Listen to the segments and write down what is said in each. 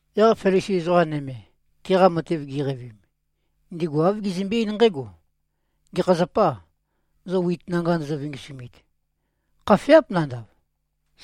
Yaq Felisi ezoqa nøme, tiqa matev giqeivim, ndigu āv gizømbe-eín nqǽgo, “Gekha zapâ, zo wit nanga ndozo-vingisumit? Khafeáp nanda,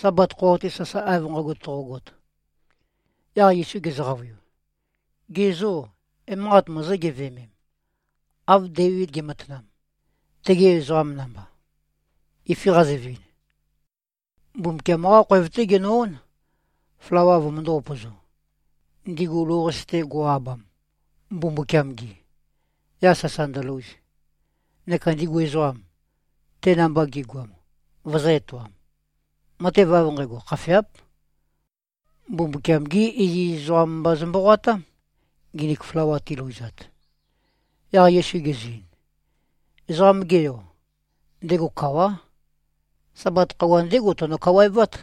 Sabat khøuwa-te sasae av nqægo toqogot.” Yaq Yesu gezø-qavøiu, “Ge zô, emanqat mozó-geveømem, av Deivid ge꞉matanam, tegi ezoqam namba, ifi qazøvin? Mbumbukiam-qá khoev-té genø-ón, flawa vømøndō-upøzo, ndigu lou-qase-te go꞉-abam, Mbumbukiam-gi, yaq sasa ndølouz, neka ndigu ezoqam, te namba gi꞉goam, vøzø̄-etoam. Matev av nqægo khafeáp. Mbumbukiam-gí iziz ezoqam mba zø-mboqoatám, nginik flawa tilouzat.” Yaq Yesu gezø-ein, “Ezoqam-ge Yo, ndego kawá. Sabat khøuwa, ndégo teno-kawaevát.”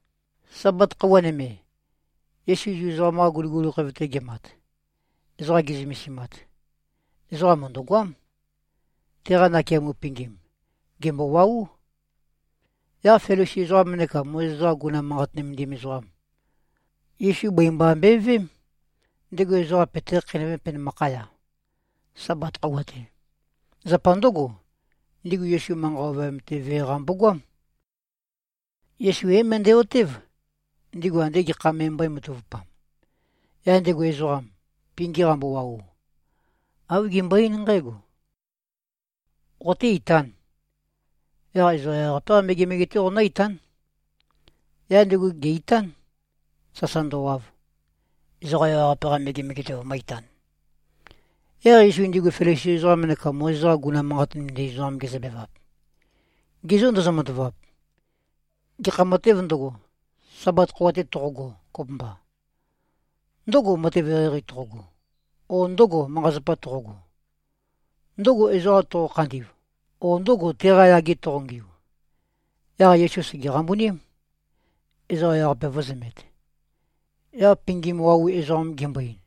Sabat khøuwa nøme, Yesu Zu ezoqam-qa guliguli khoev-te gemat, ezoqa ge꞉zømesimat, ezoqam mø̀ndøgoám. Teqa nakeamo pingim, gèmbowaú. Yaq Felisi ezoqam neka Mozes-qa guguna manqat nømendim ezoqam, Yesu bøi mba mbøeveém, ndego ezoqa peté-khakheinøvēm penømakhaya, Sabat khøuwa-te. Zapa ndǿgo, ndigu Yesu manqa ovøyam-te vee-qa mbogoám. Yesu é-møndæ-otév, ndigu ande gekha me mbómatavupam. Yaq ndego ezoqam, pingim qambowau, āv gembøe-eín nqǽgo, “Qoté-itān. Yaq ezoqa ewaqape-qá megemege-té qoqonǿ-itán.” Yaq ndego ge-ìtān, sasa ndøwav, ezoqa ewaqape-qa megemege-te vømø̄-itan. Yaq Yesu ndigu Felisi ezoqam neka Mozes-qa guguna manqat nømendim ezoqam gezøbevap, “Ge zô, ndozo-matavap. Gekha matêv ndøgo, Sabat khøuwa-te toqogo, kopømba? Ndǿgò, matev eqeieqei toqogo, o ndǿgò, manqa-zapa toqogo? Ndǿgò, ezoqa toqo-khandi꞉v, o ndǿgò, teqa yage toqongiu?” Yaq Yesu sège-qambuním, ezoqa ewaqape vø̄zømet, yaq pingim wau ezoqam gembo-ein,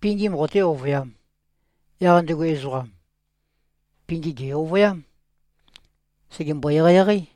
“Pingim qoté-ovøyām.” Yaq ndego ezoqam, pingim gè-ovøyám. Sègembo-eqeieqeí.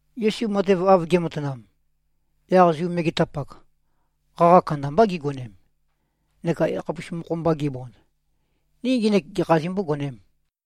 Yesu matev av ge꞉matanam, yaq Zu megetapak, qaqa kandambá gigonem, neka yakhapus mokho-mba gibond, “Ni ngenek gekhā zimbógonēm?”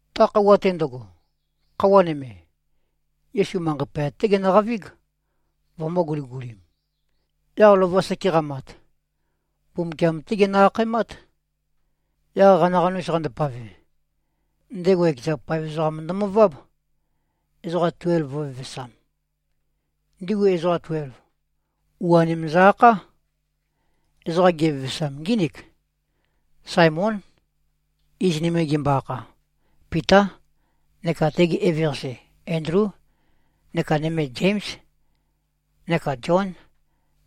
Ta khøuwa-te ndøgo, khøuwa nøme, Yesu manqei poyat-té genøqavíg, vømø̄-guligulim. Yaq lova seke qamat, Mbumbukiam-té genø-akhaemát. Yaq qanaqanus qandopave, ndego ekeza paev ezoqam ndømøváb, ezoqa tuelv vø̄vevesam. Ndigu ezoqa tuelv, u-anim zø-akhá. Ezoqam gevevesam ngínik: Saemón. Iz nøme gembo-akha, Pitá. Neka tege eveqase Endlú. Neka nøme Zéms, neka Zión,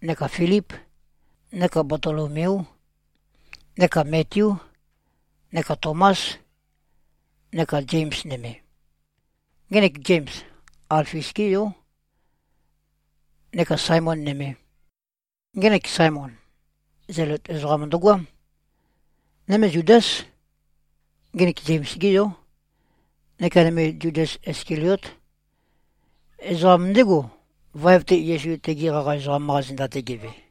neka Filíp, neka Batolomeú, neka Metiú, neka Tomás, neka Zems nømē. Ngenek Zems, Alfius-gé yó. Neka Saemōn nømē. Ngenek Saemon, Zelot ezoqam ndøgoám. Nøme Zudás. Ngenek Zems-gé yó. Neka nøme Zudas Iskaliót. Ezoqam ndégo, vaev-te Yesu tegi qaqa ezoqam-qa zenda-te geve.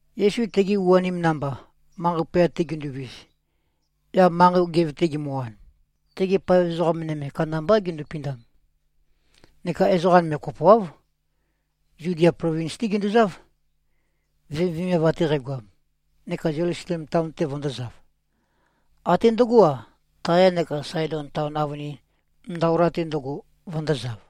Yesu tegi u-anim namba, manqei poyat-te ginduvis, yaq manqei gev-te gimøwan, tegi paev ezoqa nøme kandambá gindupindam. Neka ezoqa nøme kopoáv, Zudia plovins-té ginduzáv, vemivemiav ate qægoam, neka Zelusalem taon-te vøndōzav. Até ndøgó-a, Taya neka Saedon taon avønin, ndaola-te ndøgo, vøndōzav.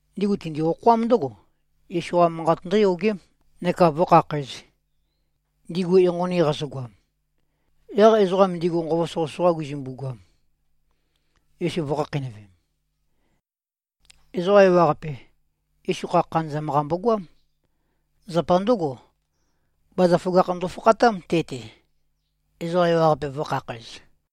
Ndigu tindi-okhoám ndǿgo, Yesu-qa manqat ndǿyogém neka vǿkhakhǣz, ndigu enqoni qazøgoam. Yaq ezoqam ndigu nqova soqøsoqa gizømbu-goam, Yesu vø̄khakheinøvem. Ezoqa ewaqape, Yesu kha khanøzam-qa mbogoám. Zapa ndǿgo, bazaføgakh ndofakhatám te-te, ezoqa ewaqape vø̄khakhæz.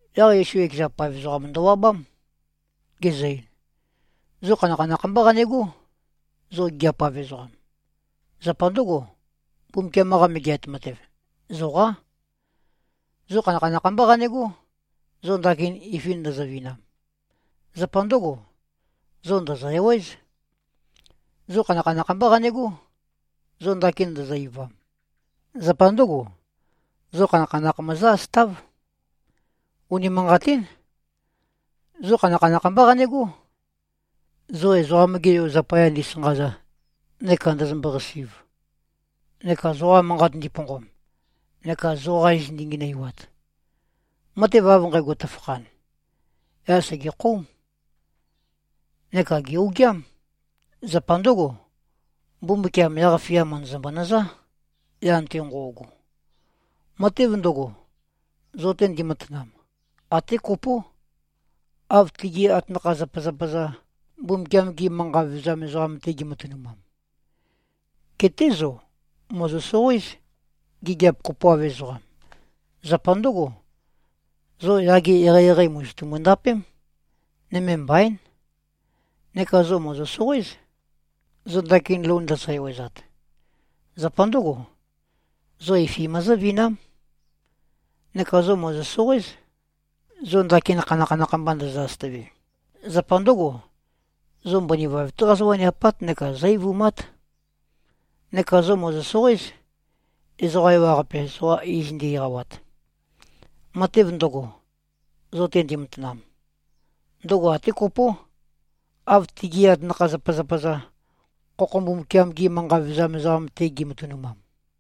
Yaq Yesu ekeza paev ezoqam ndøwabám, gezø-ein, “Zo khanakhanakh mbá qanegó, zo gigiap-av ezoqam. Zapa ndǿgo, Mbumbukiam-qa Megeat Matev, zoqá. Zo khanakhanakh mbá qanegó, zo ndakin ifi ndøzøvinam. Zapa ndǿgo, zo ndø̀zø-ewéz. Zo khanakhanakh mbá qanegó, zo ndakin ndozo-eivam. Zapa ndǿgo, zo khanakhanakh møzǿ-asøtáv. Unimanqatín, zo khanakhanakh mbá qanegó, zo Ezoqam-ge Yo zapaya ndisanqaza neka ndøzømbo-qasi꞉v neka zoqa manqat ndiponqom neka zoqa iz ndingenøiwat. Matev av nqægo tøfakhan, yaq sègekhóum, neka gè-ogiám. Zapa ndǿgo, Mbumbukiam yaq-fia mø̀ndøzømbø-nøzá, yan-te nqo꞉go. Matev ndøgo, zo-te ndimatanam, até kopó, av tigi atanakha-zapazapa-za, Mbumbukiam-gi manqa vevezam ezoqam-te gi꞉matønumam. Geté zo, mòzo-soqoéz, gigiap kopoav ezoqam. Zapa ndǿgo, zo yage eqeieqei mòzotumu-ndapém. Nøme mbaín. Neka zo, mòzo-soqoéz, zo ndakin lou ndøzø-ewezat. Zapa ndǿgo, zo ifi møzǿvinám. Neka zo, mòzo-soqoéz, zo ndakin khanakhanakh mba ndøzø-asøtøve. Zapa ndǿgo, zo mbøni vaev-té qazó-waniapát neka zó-eivumát. Neka zo, mòzo-soqoéz, ezoqa ewaqape zoqa iz ndi-eqawat. Matev ndøgo, zo-te ndimatanam, ndøgo até kopó, av tigi atanakha-zapazapa-za, khokho Mbumbukiam-gi manqa vevezam ezoqam-te gi꞉matønumam.”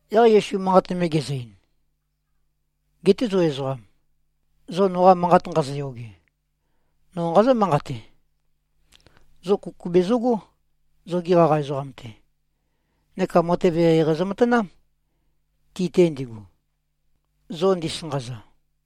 Yaq Yesu manqat nøme gezø-ein, “Geté zo ezoqam, zo noqa manqat nqazoyoge, no nqazǿ-manqate: Zo kuku bezøgó, zogi qaqa ezoqam-te. Neka matev eqeieqei zømatanám, ti-te ndigu, zo ndisanqaza.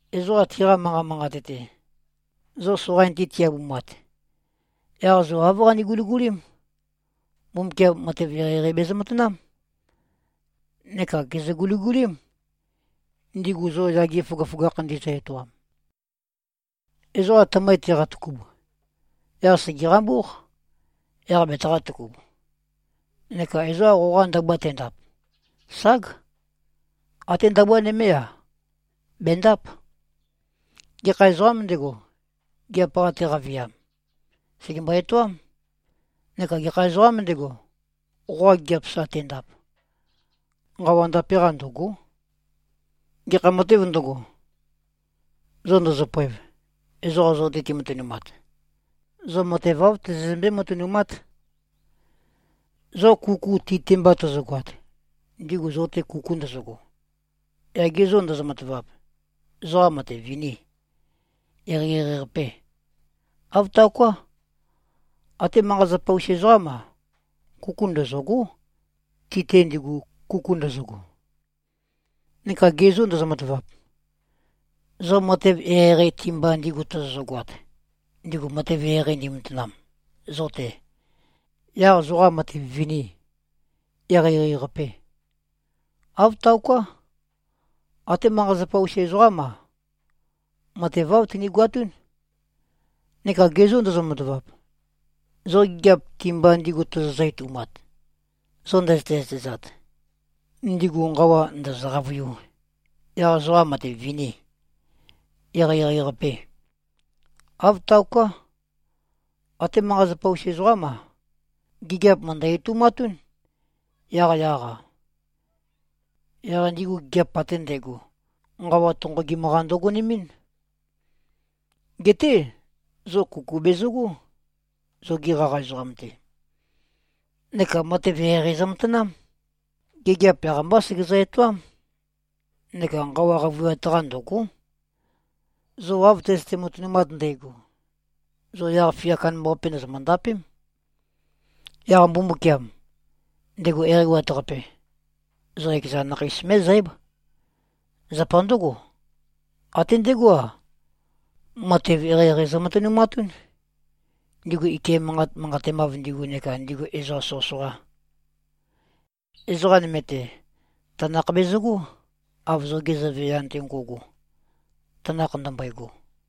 Ezoqa tiqa manqa manqat-te, zo soqain-te ti-abumat, yaq zo āv qane-guligulím: Mbumbukiam matev eqeieqei bezø-matanám. Neka gèzø-guligulím, ndigu zo yage føgøføgakh ndizø-etoam. Ezoqa tømøi teqatøkub, yaq sège-qambúq, yaq betaqā-tøkub. Neka ezoqa qoqa ndabua tendap. Ság! Até ndabua nømé-a, bèndáp. Gekha ezoqām ndego, gigiap-qa teqaviam, sègembo-etoám. Neka gekha ezoqām ndego, qoqa gigiap sa tendap, nqawa ndape-qa ndø̀go᷄. Gekha matēv ndøgo, zo ndøzøpoev, ezoqa zo-te timatønumat, zo matev āv tozozømbé-matønumát. Zo kuku ti-te mba tøzøgoat, ndigu zo-te kuku ndøzøgo, yaq ge zô ndozo-matavap, zoqa matev vinî? Eqeieqei-qapê? Āv taoká. Até manqa-zapa-us ezoqám-a, kuku ndøzø̂gó, ti-te ndigu, kuku ndøzøgo. Neka ge zô ndozo-matavap, zo matev eqeieqei ti-mba ndigu tozozø-goat, ndigu matev eqeieqei ndimatanam zo-te, yaq zoqa matev vinî? Eqeieqei-qapê? Āv taoká. Até manqa-zapa-us ezoqám-a, matev āv tinigoatún. Neka ge zô ndozo-matavap, zo gigiap ti-mba ndigu tozozø-etoumat, zo ndøzøte-zøtezat, ndigu nqawa ndø̀zø-qavøiū, yaq zoqa matev vinî? Eqeieqei-qapê? Āv taoká. Até manqa-zapa-us ezoqám-a, gigiap mø̀ndø-etoumatún, yaqyaq-a. Yaq ndigu gigiap ate ndægo, nqawa tonqogim-qa ndøgonemɨ́n. Geté, zo kuku bezøgó, zogi qaqa ezoqam-te. Neka matev eqeieqei zømatanám. Gigiap yaq-mbá segezø-etoám. Neka nqawa qavøiwat-qa ndø̀go᷄. Zo av tøzøte-matønumat ndægo, zo yaq-fia kandambaqape ndòzomø-ndapém. Yaq Mbumbukiam, ndego Eqeiwat-Qape, zo ekeza nakheis mé꞉zǽb. Zapa ndǿgo, até ndegó-a, matev eqeieqei zømatønumatún, ndigu ike manqat manqatemav ndigu neka ndigu ezoqa soqøsoqa. Ezoqa nøme-te, tanakh bezøgó, av zoge Zøve yan-te ngo꞉go, tanakh ndømbøego.”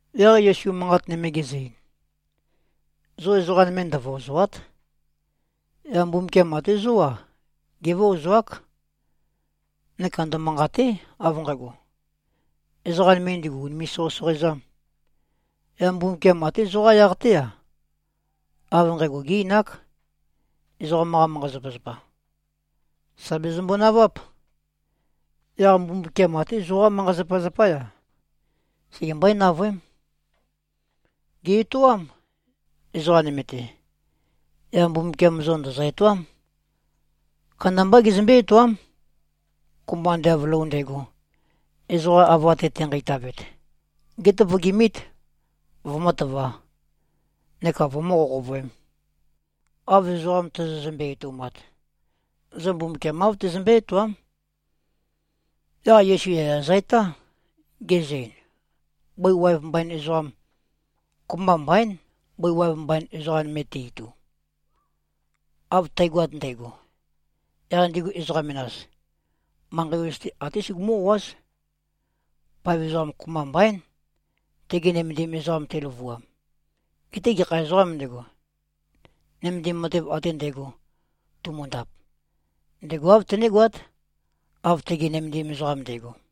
Yaq Yesu manqat nøme gezø-ein, “Zo ezoqa nøme ndøvøozòa᷄t. Yaq Mbumbukiam até zó-a gévøozoák. Neka ndømanqàte᷄, av nqægo, ezoqa nøme ndigu ùnime꞉-soqøsoqoezām. Yaq Mbumbukiam até zoqá yaq-té-a, av nqægo gé-einák. Ezoqam-qa manqa-zapazapa, sà bezømbo-naváp. Yaq Mbumbukiam até zoqá manqa-zapazapá-ya, segembøé-navøém. Gè-etoám, ezoqa nøme-te. Yaq Mbumbukiam zo ndø̀zø-etoám. Kandambá gezømbé-etoám. Kopømba ande av lou ndægo, ezoqa ava-te tenqeitavet, gétøvøgimít, vømǿtøvā, neka vømǿ-qoqovøēm. Av ezoqa tozozømbe-etoumat, zo Mbumbukiam āv tezømbé-etoám.” Yaq Yesu yaya zø-etá, gezø-ein, “Bøi waev mbain ezoqam, kopømba mbaín, bøi waev mbain ezoqa nøme te-itu. Av tægoat ndægo, yaq ndigu ezoqa menas, manqei ozu-te até sugumú-o꞉áz. Paev ezoqam kopømba mbaín, tege nømendim ezoqam teløvuam. Geté gekha ezoqām ndego, nømendim matev ate ndægo tumundap, ndego āv tenégoát, av tege nømendim ezoqam nde꞉go.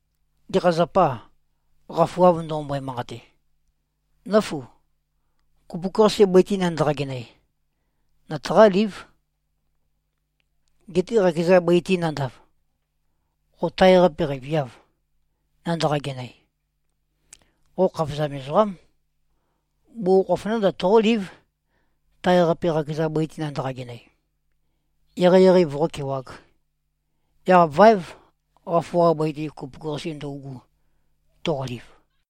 Gekha zapâ, qafu av ndoqombøe-manqate, ‘Nǿfu, kupuk-qase bøi-te nandaqa-genøe, nøtaqālīv,’ getē qakeza bøi-te nandav, qo tae-qape qeiviâv, nandaqa-genøe? Qo khavozam ezoqám. Bugukhokhof nándav, toqólív, tae-qape, qakeza bøi-te nandaqa-genøe, eqeieqei voqókewāg. Yaq váev qafu-qa bøi-te, kupuk-qase ndøugu, toqoliv.”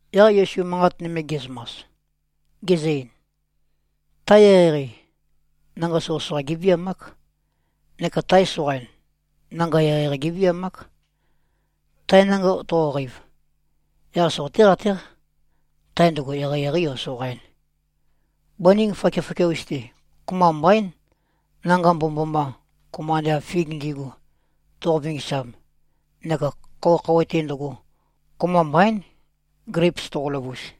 Yaq Yesu manqat nøme ge꞉zømas, gezø-ein, “Tae eqeieqei, nanga soqøsoqa géviamák. Neka tae soqain, nanga eqeieqei géviamák. Tae nanga toqoqeiv, yaq soqoté-qatéq, tae ndøgo eqeieqeī o soqain. Bøning fakiafakia-us-te, kopømba mbaín, nanga mbomømboma, kopømba ande av fig ndi꞉gu, toqo-vingisam. Neka khouwe-khouwe-te ndøgo, kopømba mbaín, gleips toqo-løvus.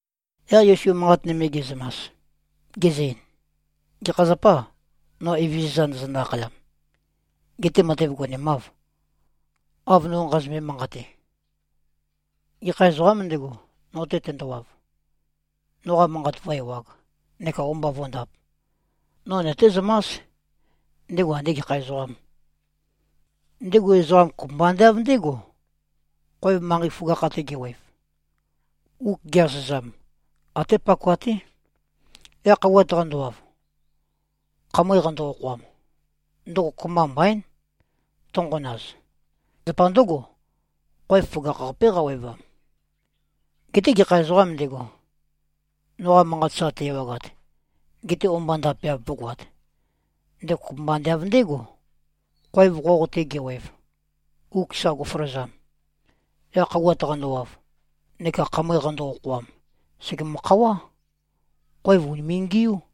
Yaq Yesu manqat nøme ge꞉zømas, gezø-ein, “Gekha zapâ, no Evezøza ndozonø-akhayam, getē matev gonemāv, av no nqazømbe-manqate? Gekha ezoqām ndego, no-te tendowav, noqa manqat vǿ-ewāg, neka o-mba vó꞉ndāp, no nøtézømás, ndego andē gekha ezoqām. Ndego ezoqam, kopømba ande av ndé꞉go, khoev manqei føgakh-te gewev. Uk ge-asøzam, até pakoa-té. Yaq khouwat qandowav, khamøe qando-okhoam, ndøgo kopømba mbaín, tønqonaz. Zapa ndǿgo, khoev føgakh-qapé qawevam. Geté gekha ezoqām ndego, noqa manqat sa te-ewagat, gete o-mba ndapeav vǿgoāt, ndego kopømba ande av ndé꞉go, khoev qoq-te gewev, uk sa go꞉føløzam. Yaq khouwat qandowav neka khamøe qando-okhoam, sègemø-khawá. Khoev ùnime꞉-ngiú.”